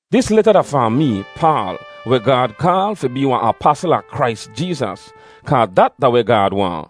Dis leta da fahn mee, Paal, weh Gaad kaal fi bee wahn apasl a Krais Jeezas, kaa dat da weh Gaad waahn.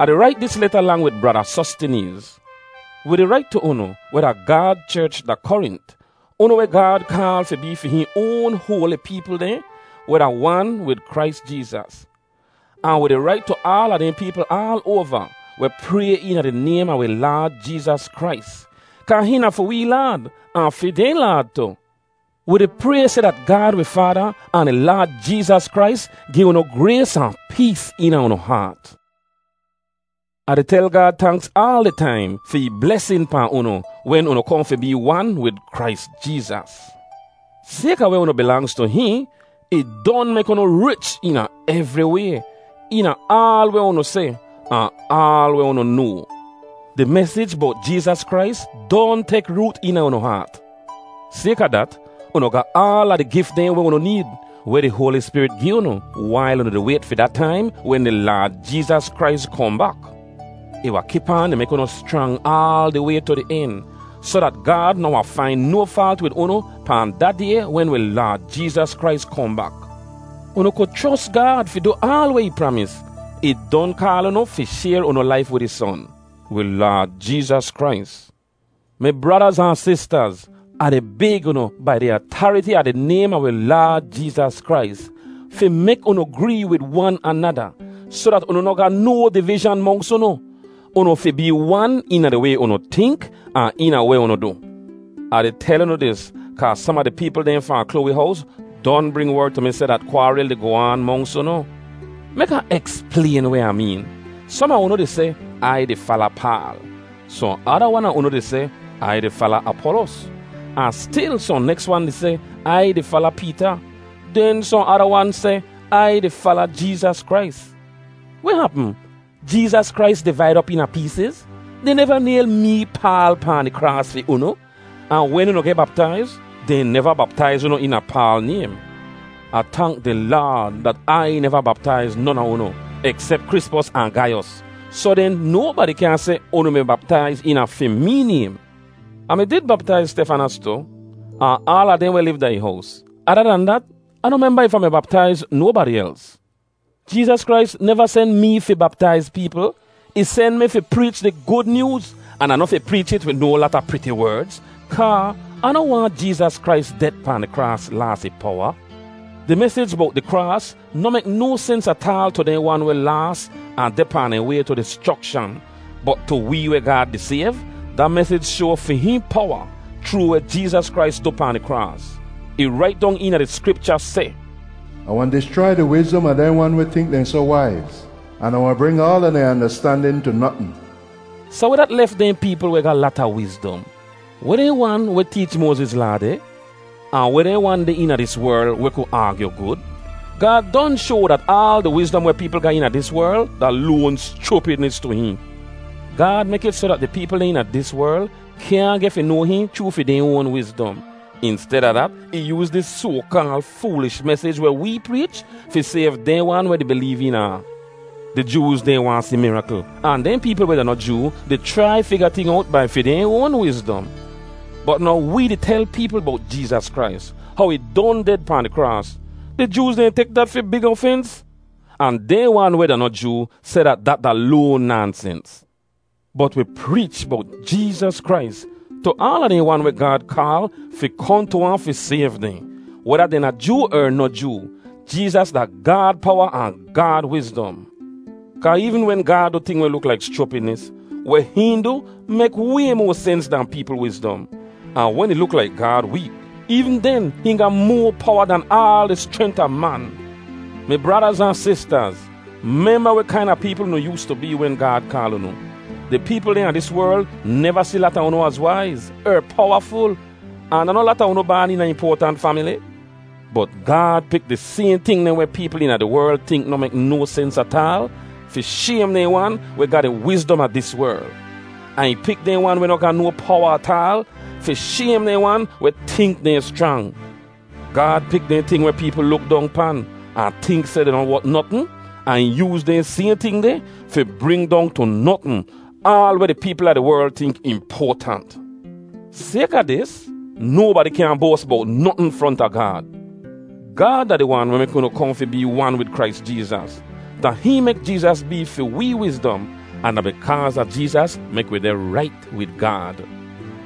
Ah di rait dis leta lang wid Brada Sostineez. Wi di rait tu unu, weh da Gaad cherch da Korint, unu weh Gaad kaal fi bee fi hihn oan hoali peepl dehn weh da wan wid Krais Jeezas. Ahn wi di rait tu aala dehn peepl aal oava, weh pray eena di naym a wi Laad Jeezas Krais, kaa hihn da fi wee Laad, ahn fi dehn Laad tu. Wi di pray seh dat Gaad wi Faada ahn di Laad Jeezas Krais gi unu grays ahn pees eena unu haat. Ah di tel Gaad tanks aal di taim fi ih blesin pahn unu wen unu kohn fi bee wan wid Krais Jeezas. Sayka weh unu bilangz tu hihn, ih don mek unu rich eena evri way, eena aal weh unu seh, ahn aal weh unu noa. Di mesij bowt Jeezas Krais don tek root eena unu haat. Sayka dat, unu ga aala di gif dehn weh unu need, weh di Hoali Spirit gi unu, wail unu di wayt fi da taim wen di Laad Jeezas Krais kohn bak. Ih wahn kip aan di mek unu schrang aal di way tu di en, soh dat Gaad noh wahn fain no faalt wid unu pahn da Day wen wi Laad Jeezas Krais kohn bak. Unu ku chros Gaad fi du aal weh ih pramis. Ih don kaal unu fi shayr unu laif wid ih Son, wi Laad Jeezas Krais. Mi bradaz ahn sistaz, Ah di bayg unu, bai di atariti a di naym a wi Laad Jeezas Krais, fi mek unu gree wid wan anada soh dat unu noh ga no divizhan monks unu. Unu fi bee wan eena di way unu tink, ahn eena weh unu du. Ah di tel unu dis, kaa som a di peepl dehn fahn Kloawi hows don bring werd tu mi seh dat kwaaril di goh aan monks unu. Mek Ah eksplayn weh Ah meen: Som a unu di seh, “Ai di fala Paal.” Sohn ada wan a unu di seh, “Ai di fala Apolos.” Ahn stil sohn neks wan di seh, “Ai di fala Peeta.” Den sohn ada wan seh, “Ai di fala Jeezas Krais.” Weh hapm? Jeezas Krais divaid op eena peesiz? Dehn neva nayl mee, Paal, pahn di kraas fi unu. Ahn wen unu geh baptaiz, dehn neva baptaiz unu eena Paal naym. Ah tank di Laad dat Ai neva baptaiz non a unu, eksep Krispos ahn Gaiyos. Soh den, nobadi kyaahn seh unu mi baptaiz eena fi mee naym. (Ah mi did baptaiz Stefanas tu, ahn aala dehn weh liv da ih hows. Ada dan dat, Ah noh memba if Ah mi baptaiz nobadi els.) Jeezas Krais neva sen mee fi baptaiz peepl. Ih sen mi fi preech di Gud Nyooz. An Ah noh fi preech it wid no lata priti werdz, kaa Ah noh waahn Jeezas Krais det pahn di kraas laas ih powa. Di mesij bowt di kraas noh mek no sens ataal tu dehn wan weh laas ahn deh pahn dehn way tu dischrokshan; bot tu wee weh Gaad di sayv, da mesij shoa fi hihn powa chroo weh Jeezas Krais du pahn di kraas. Ih rait dong eena di Skripcha seh, “Ah wahn dischrai di wizdom a dehn wan weh tink dehn soh waiz, an Ah wahn bring aala dehn andastandin tu notn.” Soh weh dat lef dehn peepl weh ga lata wizdom? Weh dehn wan weh teech Moaziz Laa deh? Ahn weh dehn wan deh eena dis werl, weh ku aagyu gud? Gaad don shoa dat aal di wizdom weh peepl ga eena dis werl da loan schupidnis tu hihn. Gaad mek it soh dat di peepl dehn eena dis werl kyaahn geh fi noa hihn chroo fi dehn oan wizdom. Insteda dat, ih yooz dis soa-kaal foolish mesij weh wee preech fi sayv dehn wan weh di bileev eena ahn. Di Jooz dehn waahn si mirakl, ahn dehn peepl weh da noh Joo di chrai figa ting owt bai fi dehn oan wizdom. Bot now wee di tel peepl bowt Jeezas Krais, how ih don ded pahn di kraas. Di Jooz dehn tek dat fi big ofens, ahn dehn wan weh da noh Joo seh dat dat da loan naansens. Bot wi preech bowt Jeezas Krais tu aala dehn wan weh Gaad kaal fi kohn tu ahn fi sayv dehn, weda dehn da Joo er noh Joo. Jeezas da Gaad powa ahn Gaad wizdom. Kaa eevn wen Gaad du ting weh luk laik schupidnis, weh hihn du mek way moa sens dahn peepl wizdom. Ahn wen ih luk laik Gaad week, eevn den hihn ga moa powa dahn aal di schrent a man. Mi bradaz ahn sistaz, memba weh kaina peepl unu yoostu bee wen Gaad kaal unu. Di peepl dehn a dis werl neva si lata unu az waiz, er powaful, ahn da noh lata unu baan eena impoatant famili. Bot Gaad pik di sayhn ting dehn weh peepl eena di werl tink noh mek no sens ataal, fi shaym dehn wan weh ga di wizdom a dis werl. Ahn ih pik dehn wan weh noh ga no powa ataal, fi shaym dehn wan weh tink dehn schrang. Gaad pik dehn ting weh peepl luk dong pan, ahn tink seh dehn noh wot notn; ahn ih yooz dehn sayhn ting deh fi bring dong tu notn aal weh di peepl a di werl tink impoatant. Sayka dis, nobadi kyaahn boas bowt notn fronta Gaad. Gaad da di Wan weh mek unu kohn fi bee wan wid Krais Jeezas. Da hihn mek Jeezas bee fi wee wizdom, ahn da bikaaz a Jeezas mek wi deh rait wid Gaad.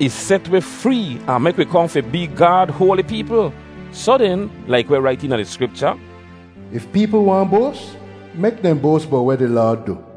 Ih set wi free ahn mek wi kohn fi bee Gaad hoali peepl. Soh den, laik weh rait eena di Skripcha, “If peepl waahn boas, mek dehn boas bowt weh di Laad du.”